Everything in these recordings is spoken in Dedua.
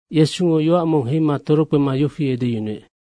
Yesungo yoac mong heima torokpema yofi edeyunuec,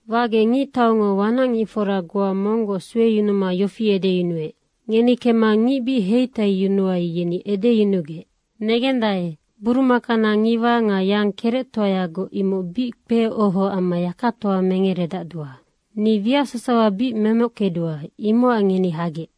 Wagec ngictaungo wanacngicfora goa monggoc sueyunuma yofi deec, ‘Ngeni kemma ngic bic heitaiyunuai, yeni edeyunugec, “Negendae, burumakana ngiwa nga yang kerectoayagoc imoc bic kpeoho amma yakatoa mengeredacdua. Ni wiac sasawa bic memockedua, imocac ngeni hagec.” ’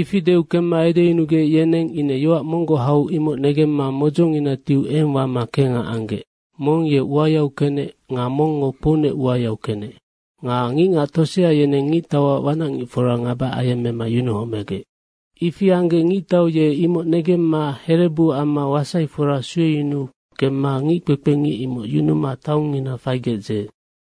Ifi deu kemma edeyunugec, yeneng ine yoac monggoc hau imoc negemma modzongina tiu eng wama kengha anggec. Mong ye uayau kenec nga mongngo kpounec uayau kenec. Nga ngicngac tosea yeneng ngictauac wanacngicfora ngaba ayemmema yunuhomegec. Ifi anggec ngictau ye imoc negemma herebu amma wasaifora sueyunuu kemma ngickpekpengic imoc yunuma taongngina faigec dzeec.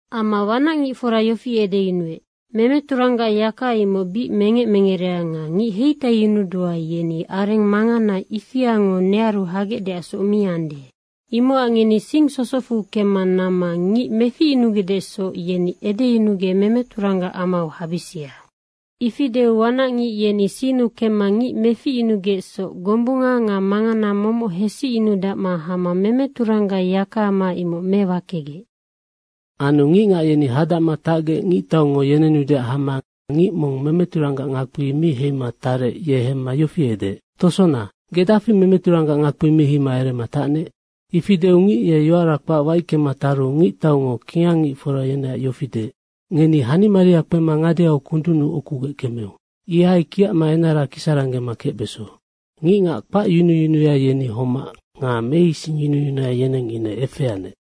Amma wanacngicfora yofi edeyunuec, ‘Memeturanggac yaka imoc bic mengec mengerea nga ngic heitaiyunudua, yeni areng mangana ifiango nearu hagecdeacsoc mi ande. Imocac ngeni sing sosocfu kemma namma ngic meficyunugecdesoc, yeni edeyunugec memeturanggac amau habisia.’ Ifi deu wanacngic yeni sinnu kemma ngic meficyunugecsoc gombunga nga mangana momoc hesicyunudacma hama memeturanggac yakaama imoc mewakegec. Anu ngicngac yeni hadacma tacgec ngictaungo yenenudeac hama ngic mong memeturanggac ngakpi mi heima tarec, ye hemma yofi edeec, ‘Tosona, ge dafi memeturanggac ngakpi mi heima erema tacnec?’ Ifi deu ngic ye yoara kpac waickema taru ngictaungo kingangngicfora yeneac yofi deec, ‘Ngeni hanimaria kpema ngadeau kundunnu ukugec kemeu. Ihai kiacma enara kisaranggema kecbeso.’ Ngicngac kpacyunuyunuya, yeni homac nga meisingyunuyunuya, yeneng ine efeanec.”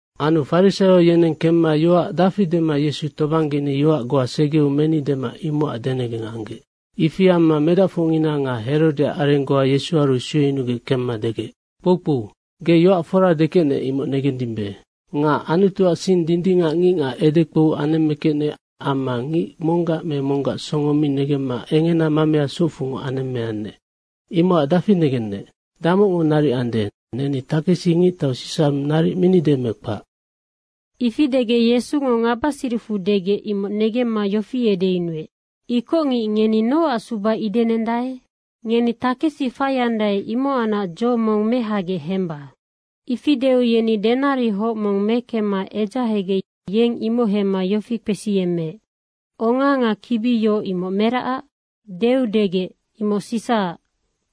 Anu farisaio yeneng kemma yoac dafi dema Yesu tobanggeni yoac goa segeu meni dema imocac denegeng anggec. Ifi amma medacfocngina nga Herodeac areng goa Yesuaru sueyunugec kemma degec, “Kpoukpou, ge yoac fora dekecnec, imoc negendimbe. Nga Anutuac sing dindingac ngicngac edekpou anemmekecnec amma ngic monggac me monggac songo mi negemma engena mamea socfungoc anemmeannec. Imocac dafi negennec, damocngo naric ande, neni takesi ngictau Sisa naric minide me kpac?” Ifi degec Yesungo ngabasiricfu degec, imoc negemma yofi edeyunuec, “Ikocngic, ngeni nocac suba idenendae? Ngeni takesi faiandae, imohacnac dzo mong mehagec hemba.” Ifi deu yeni denarihoc mong mekemma edzahegec yeng imoc hemma yofi kpesiyemmeec, “Onga nga kibi yoc, imoc meracac?” Deu degec, “Imoc Sisaac.”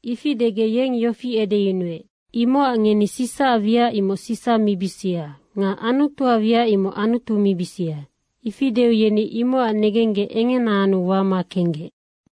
Ifi degec yeng yofi edeyunuec, “Imocac ngeni Sisaac wiac Sisa mibisia nga Anutuac wiac Anutu mibisia.” Ifi deu yeni imocac negenggec engena anu wama kenggec.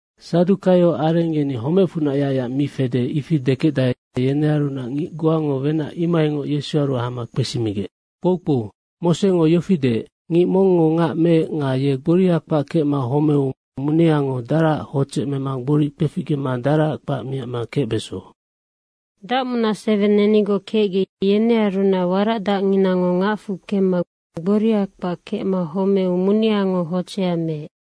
Sadukaio areng yeni homecfunac yacyac mi fede, ifi dekecdae, yenearunac ngic goango wenac imohaingoc Yesuaru hama kpesimigec, “Kpoukpou, Mosengo yofi deec, ‘Ngic mongngo ngac meec nga ye gboriha kpac kecma homeu muneango daraac hodzec mema gboric kpeficgema daraac kpac miacma kecbeso.’ Dacmunac seweng nenigoc kecgec, yenearunac waracdacnginango ngacfu kemma gboriha kpac kecma homeu muneango hodzeha meec.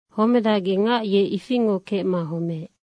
Homedacgec ngac ye ifingoc kecma homeec.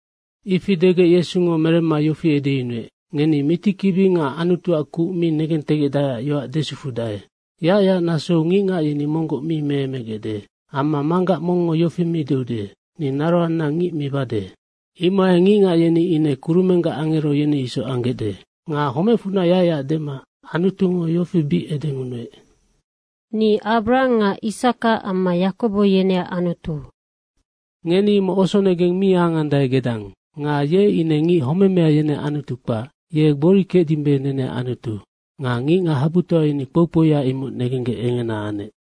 Ifi degec Yesungo meremma yofi edeyunuec, “Ngeni mitikibi nga Anutuac kuc mi negentegecdaeac yoac desufudae. Yacyac nasou ngicngac yeni monggoc mi meemegecde amma manggac mongngo yofi mi deude, ‘Ni naroanna ngic mibade.’ Imohai ngicngac yeni ine kurumenggac angero, yeni isoc anggecde. Nga homecfunac yacyac dema Anutungo yofi bic edengunuec, ‘Ni Abrahang nga Isaka amma Yakobo, yeneac Anutu.’ Ngeni imoc osonegeng mi angandae gedang. Nga ye ine ngic homemea, yeneac Anutu kpac. Ye gbori kecdimbe, neneac Anutu.” Nga ngicngac habutoa yeni kpoukpouya imoc negenggec engena anec.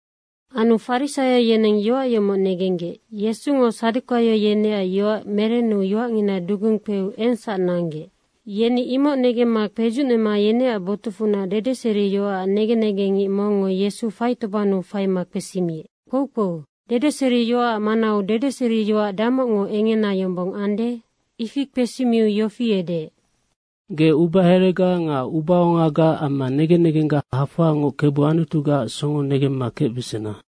Anu farisaio yeneng yoac yomoc negenggec, “Yesungo sadukaio yeneac yoac merenu yoacngina dugung kpeu engsac nanggec.” Yeni imoc negemma kpedzucnema yeneac botucfunac dedeseriyoacac negen negengngic mongngo Yesu faitobannu faima kpesimiec, “Kpoukpou, dedeseriyoacac manau dedeseriyoac damocngo engena yombong ande?” Ifi kpesimiu yofi edeec, “‘Ge ubaherega nga ubaongaga amma negen negengga hafoangoc Kebu Anutugaac songo negemma kecbesena.’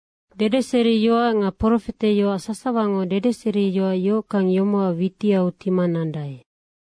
Dedeseriyoac nga profeteyoac sasawango dedeseriyoac yohockang yomocac witiau tima nandae.”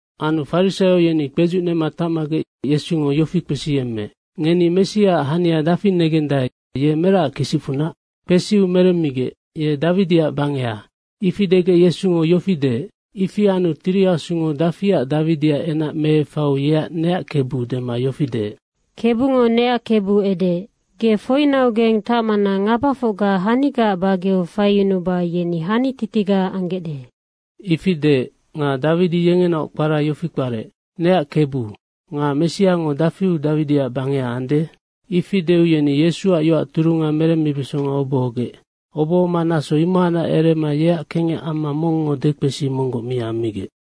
Anu farisaio yeni kpedzucnema tacmagec Yesungo yofi kpesiyemmeec, “Ngeni Messiaac hania dafi negendae, ye meracac kisicfunac?” Kpesiu meremmigec, “Ye Dawidiac bangeha.” Ifi degec Yesungo yofi deec, “Ifi anu Tiri Asungo dafiac Dawidiac enac meefaiu yeac ‘Neac Kebu.’ dema yofi deec,” “KEBUNGO neac Kebu edeec, ‘Ge foinaugeng tacmana ngabafocga hanigaac bageau faiyunuba yeni hanititiga anggecde.’” Ifi deec. Nga Dawidi yengenaoc kpara yofi kparec, “Neac Kebu. Nga Messiango dafiu Dawidiac bangeha ande?” Ifi deu yeni Yesuac yoac turunga merembesonga obohogec. Obohoma naso imohacnac erema yeac kengec amma mongngo dekpesi monggoc mi ammigec.